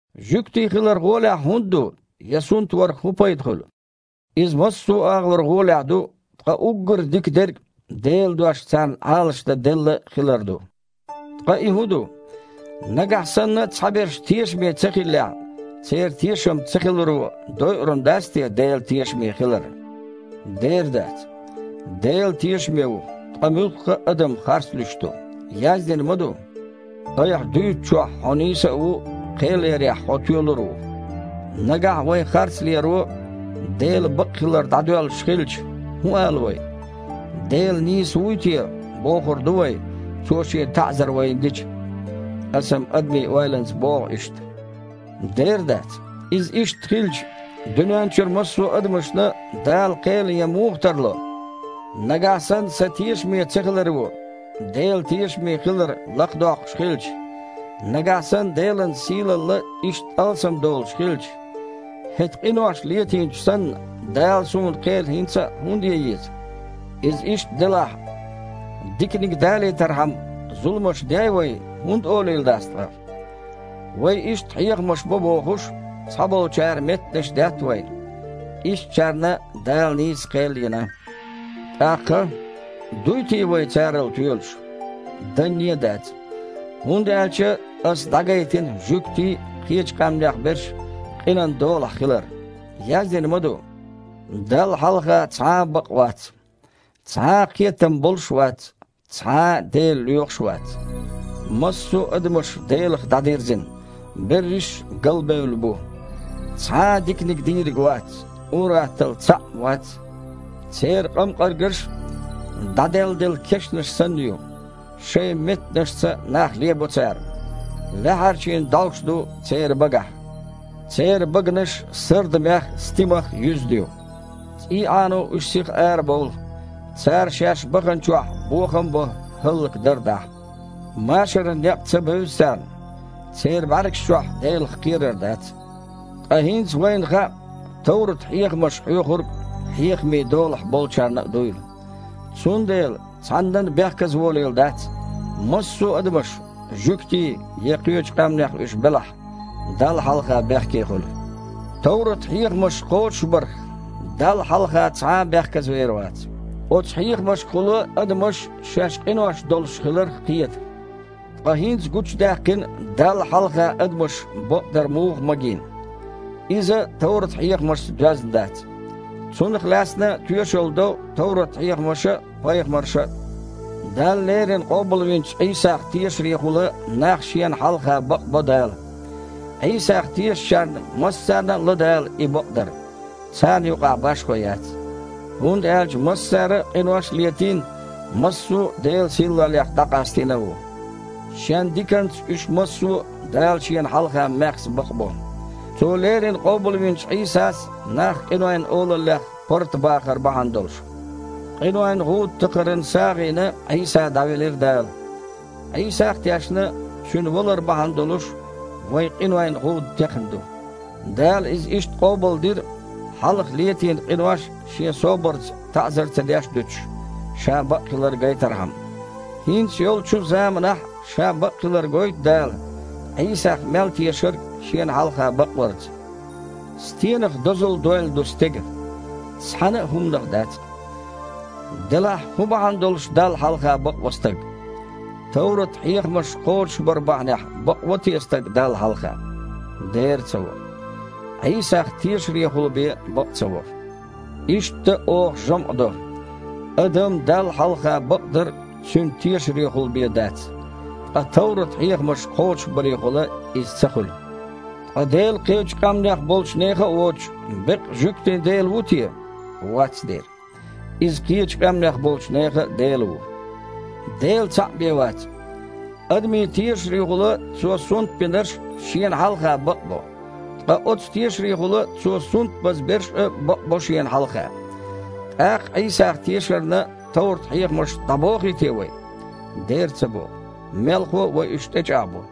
Жуьгти хилар гІолехь хІунда ду, я сунтварх хІун пайда хуьлу? Иза массо а агІор гІолехь ду, ткъа уггар а дика дерг Делан дош царна Іалашдан делла хилар ду. Ткъа и хІун ду? Нагахь санна цхьаберш тешаме ца хиллехь, церан тешам цахиларо дойур-м дац те Делан тешаме хилар? Дера дац! Дела тешаме ву, ткъа муьлхха а адам харцлуьйш ду. Яздина ма ду: «Айхьа дуьйцучохь Хьо нийса а ву, кхел ярехь Хьо тоьлур а ву». Нагахь вайн харцлеро Делан бакъхилар дІадоьллуш хилча, хІун ала вай? Дела нийса вуй те, бохур ду вай, Цо Шен таІзар вайна дича? (Аса-м адаман ойланца боху иштта.) Дера дац! Иза иштта хилча, дуьнен чуьра массо а адамашна Дала кхел ян муха тарло? Нагахь санна сан тешаме цахиларо Делан тешаме хилар лакхадоккхуш хилча, нагахь санна Делан сийлалла иштта алсамдолуш хилча, хІета къинош летийначунна санна Дала суна кхел хІинца а хІунда ян еза? Иза иштта делахь: «Диканиг далийтархьама, зуламаш дей вай» хІунда олийла дац ткъа? Вай иштта хьехамаш бо бохуш, цхьаболчара меттанаш детта вайна. Ишттачарна Дала нийса кхел йина. ТІаккха? Дуй те вай царал тоьлуш? Данне а дац, хІунда аьлча ас дІагайтина жуьгтий а, кхечу къаьмнех берш а къинан долахь хилар. Яздина ма ду: «Далла хьалха цхьа а бакъ вац. Цхьа а кхетам болуш а вац, цхьа а Дела лоьхуш а вац. Массо а адамаш Делах дІадирзина, берриш а галбевлла бу. Цхьа а диканиг дийриг вац, ур-атталла цхьаъ-м вац. Церан къамкъаргаш дІаделладелла кешнаш санна ю. Шайн меттанашца нах лебо цара. Лаьхьарчийн дІовш ду церан багахь. Церан баганаш сардамех а, стимах а юьзна ю. ЦІий Іано уьш сиха арабовлу. Цара шаьш баханчохь бохам а бо, хІаллакдар а дахьа. Машаран некъ ца бевза царна. Церан бІаьргаш чохь Делах кхерар дац». Ткъа хІинца вайна хаьа, товрат-хьехамаша хьоьхург хьехамийн долахь болчарна а дуйла. Цундела цхьаннан а бехказаволийла дац: массо а адамаш – жуьгтий я кхечу къаьмнех уьш белахь, Далла хьалха бехке хуьлу. Товрат-хьехамаш кхочушбарх, Далла хьалха цхьа а бехказавер вац. Оцу хьехамашкахула адамаш шаьш къинош хиларх кхета. Ткъа хІинца гучудаьккхина Далла хьалха адамаш бакъдар муха магийна. Иза товрат-хьехамашца доьзна дац. Цунах лаьцна тоьшалла до товрат-хьехамаша а, пайхамарша а. Дала леррина къобалвинчу Іийсах тешарехула нах Шена хьалха бакъбо Дала. Іийсах тешачарна массарна а ло Дала и бакъдар. Царна юкъахь башхо яц, хІунда аьлча массара а къинош а летийна, массо а Делан сийлаллех дІакъастийна а ву. Шен диканца уьш массо а Дала Шена хьалха маьхза бакъбо, Цо леррина къобалвинчу Іийсас нах къинойн олаллех паргІатбахар бахьана долуш. Къинойн гІуда такхаран сагІина Іийса дІавелира Дала. Іийсах а тешна, Цуьнан валар бахьана долуш, вайн къинойн гІуда текхна ду. Дала иза иштта къобалдира, хьалха летийна къинош Шен собарца таІзар ца деш а дуьтуш, Ша бакъ хилар гайтархьама. ХІинца йолчу заманахь а Ша бакъ хилар гойту Дала, Іийсах мел тешарг Шена хьалха бакъварца. Стенах дозалла дойла ду стеган? Цхьана а хІуманах дац! Делахь хІун бахьана долуш Далла хьалха бакъво стаг? Товрат-хьехамаш кхочушбар бахьанехь бакъво те стаг Далла хьалха? Дера ца во! Іийсах тешарехула бен бакъ ца во! Иштта, оха жамІ до: адам Далла хьалха бакъдар цуьнан тешарехула бен дац, ткъа товрат-хьехамаш кхочушбарехула иза ца хуьлу. Ткъа Дела кхечу къаьмнех болчу нехан а воцуш, беккъа жуьгтийн Дела ву те? Вац дера, Иза кхечу къаьмнех болчу нехан а Дела ву. Дела цхьаъ бен вац. Адамийн тешарехула Цо сунтбинарш Шена хьалха бакъбо, ткъа оццу тешарехула Цо сунтбаза берш а бакъбо Шена хьалха. ТІаккха Іийсах тешарна товрат-хьехамаш дІабохий те вай? Дера ца боху. Мелхо а, вай уьш тІечІагІбо.